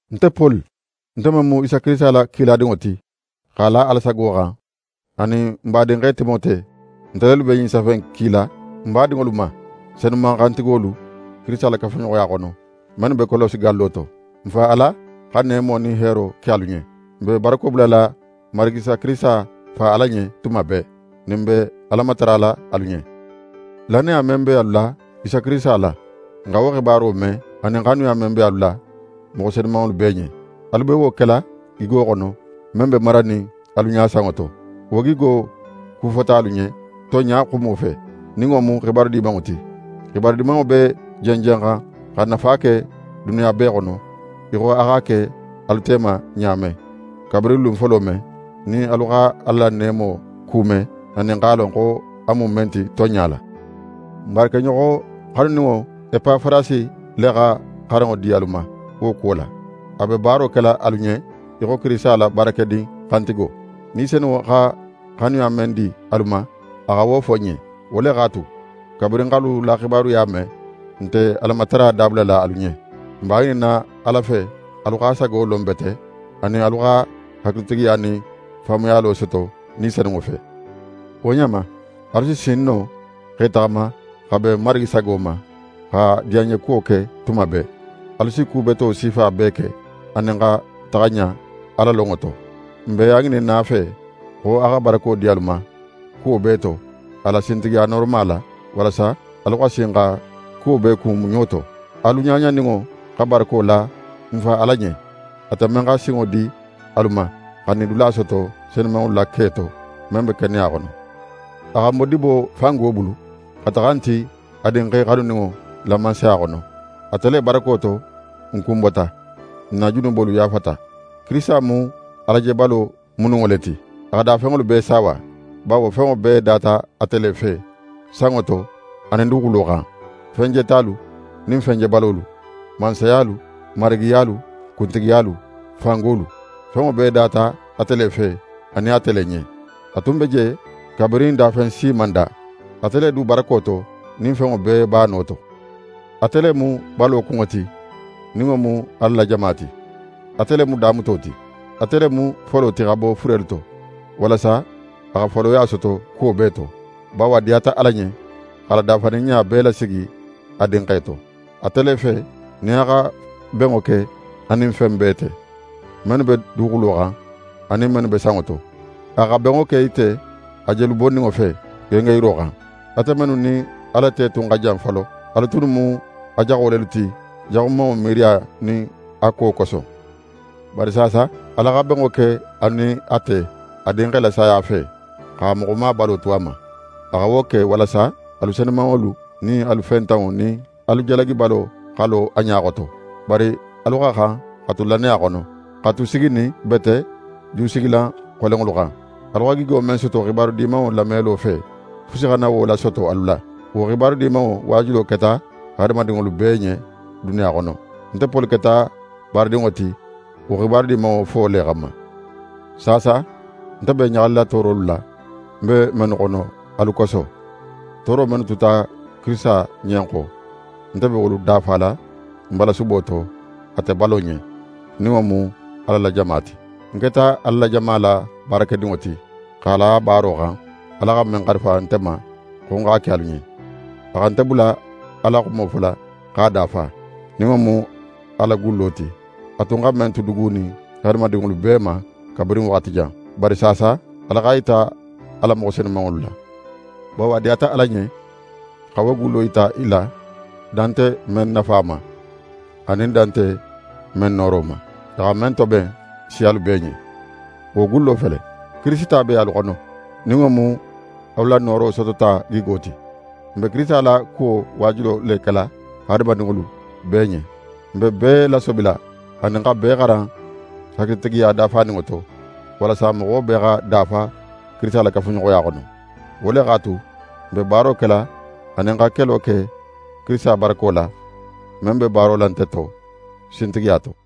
Nte Poli, nte men mu Isa Kirisita la kiladinŋo ti, x'a la Ala sago xan, anin n badinxe Timote, nte lelu be ɲin safe in kila n badinŋolu ma, senuman xantigolu Kirisita la kafuɲoxoya xono, mennu be Kolose gallo to. N Fa Ala xa neemo nin heero ke alu ɲen. N be barako bulala n Marigi Isa Kirisita Fa Ala ɲen tuma bee, nin n be Ala matarala alu ɲen. Lannaya men be alu la Isa Kirisita la, n xa wo xibaro me anin xanuya men be alu la, moxo senumanŋolu bee ɲen. Alu be wo kela gigo xono, men be maranin alu ɲa sanŋo to. Wo gigo kufota alu ɲen tonɲa xumo fe, nin wo mu xibaru Dimanŋo ti. Xibaru Dimanŋo be jenjenxan xa nafa ke duniya bee xono, í xo a x'a ke alu tema ɲa men, kabirin lun folo men, nin alu xa Ala la neemo kume anin x'a lon a mu men ti tonɲa la. N baarakeɲoxo xanuninŋo Epafarasi le xa xaranŋo di alu ma wo kuwo la. A be baaro kela alu ɲen í xo Kirisita la baarakedin xantigo. Ni Senunŋo xa xanuya men di alu ma, a xa wo fo n ɲen. Wo le x'a tu, kabirin n x'alu la xibaruya me, n nte Alamatara dabulala alu ɲen. N b'a ŋininna Ala fe alu x'a sago lon bete, anin alu xa hakilitigiya nin faamuyalo soto Ni Senunŋo fe. Wo ɲa ma, alu si sin no x'e taxama x'a ben Marigi sago ma, x'a diyanɲekuwo ke tuma bee. Alu si ku beto sifa bee ke, anin xa taxa ɲa Ala lonŋo to. N be a ŋininna a fe, xo a xa barako di alu ma kuwo bee to, a la sintigiya nooroma la, walasa alu xa sin xa kuwo bee kun muɲo to. Alu ɲaɲaninŋo xa barako la n Fa Ala ɲen, ate men xa sinŋo di alu ma xa nidula soto senumanŋolu la ke to, men be keneya xono. A xa n bo dibo fango bulu, xa taxa n ti a Dinxe xanuninŋo la mansaya xono. Ate le barako to n kunbota, n na junubolu yaafata. Kirisita mu Alajebalo mununŋo le ti. A xa dafenŋolu bee saawa. Bawo fenŋo bee data ate le fe, sanŋo to anin duguxulo xan, fen jetalu nin fen jebalolu, mansayalu, marigiyalu, kuntigiyalu, fangolu. Fenŋo bee data ate le fe anin ate le ɲen. A tun be je kabirin dafen si man da, ate le du barako to, nin fenŋo bee b'a no to. Ate le mu balo kunŋo ti, nin wo mu Ala la jama ti. Ate le mu damuto ti. Ate le mu folo ti xa bo furelu to, walasa a xa foloya soto kuwo bee to. Bawo a diyata Ala ɲen x'a la dafaninɲa bee lasigi a Dinxe to. Ate le fe, nin a xa benŋo ke a nin fen bee te: Mennu be duguxulo xan, anin mennu be sanŋo to. A xa benŋo ke i te a jelu bonninŋo fe, gengenyiro xan. Ate mennu nin Ala te tun xa jan folo, alu tunnu mu a jaxo lelu ti jaxumanŋo miiriya nin a ko koso. Bari saasa, Ala xa benŋo ke alu nin a te, a Dinxe la saya fe, x'a moxoma balo tu a ma. A xa wo ke walasa alu senumanŋo nin alu fentanŋo nin alu jalagibalo xa lo a ɲa xoto. Bari alu xa xan xa tu lannaya xono, xa tu siginin bete jusigilan xolenŋolu xan. Alu xa gigo men soto xibaru Dimanŋo lamelo fe, fusi xana wo lasoto alu la. Wo Xibaru Dimanŋo waajulo keta hadamadinŋolu bee ɲen duniya xono. Nte Poli keta baaradinŋo ti wo Xibaru Dimanŋo fo le xanma. Saasa, nte be ɲaxalila toorolu la, ń be mennu xono alu koso. Tooro mennu tuta Kirisita ɲen xo, nte be wolu dafala ń balasubo to ate balo ɲen, nin wo mu Ala la jama ti. Ń keta Ala la jama la baarakedinŋo ti, x'a la baaro xan, Ala xa men xarifa nte ma xo ń x'a ke alu ɲen: A xa nte bula Ala la xumo fola x'a dafa, nin wo mu a la gullo ti, a tun xa men tu dugunin hadamadinŋolu bee ma kabirin waxati jan. Bari saasa, Ala x'a yita a la moxo senumanŋolu la. Bawo a diyata Ala ɲen xa wo gullo yita i la, dan nte men nafa ma, anin dan nte men nooro ma, a xa men toben siyalu bee ɲen. Wo gullo fele: Kirisita be alu xono, nin wo mu alu la nooro sotota gigo ti. N be Kirisita la kuwo waajulo le kela hadamadinŋolu bee ɲen. N be bee lasobila anin xa bee xaran hakilitigiya dafaninŋo to, walasa moxo bee xa dafa Kirisita la kafuɲoxoya xono. Wo le x'a tu, nte be baaro kela anin xa kelo ke Kirisita barako la, men be baaro la nte to, sintigiya to.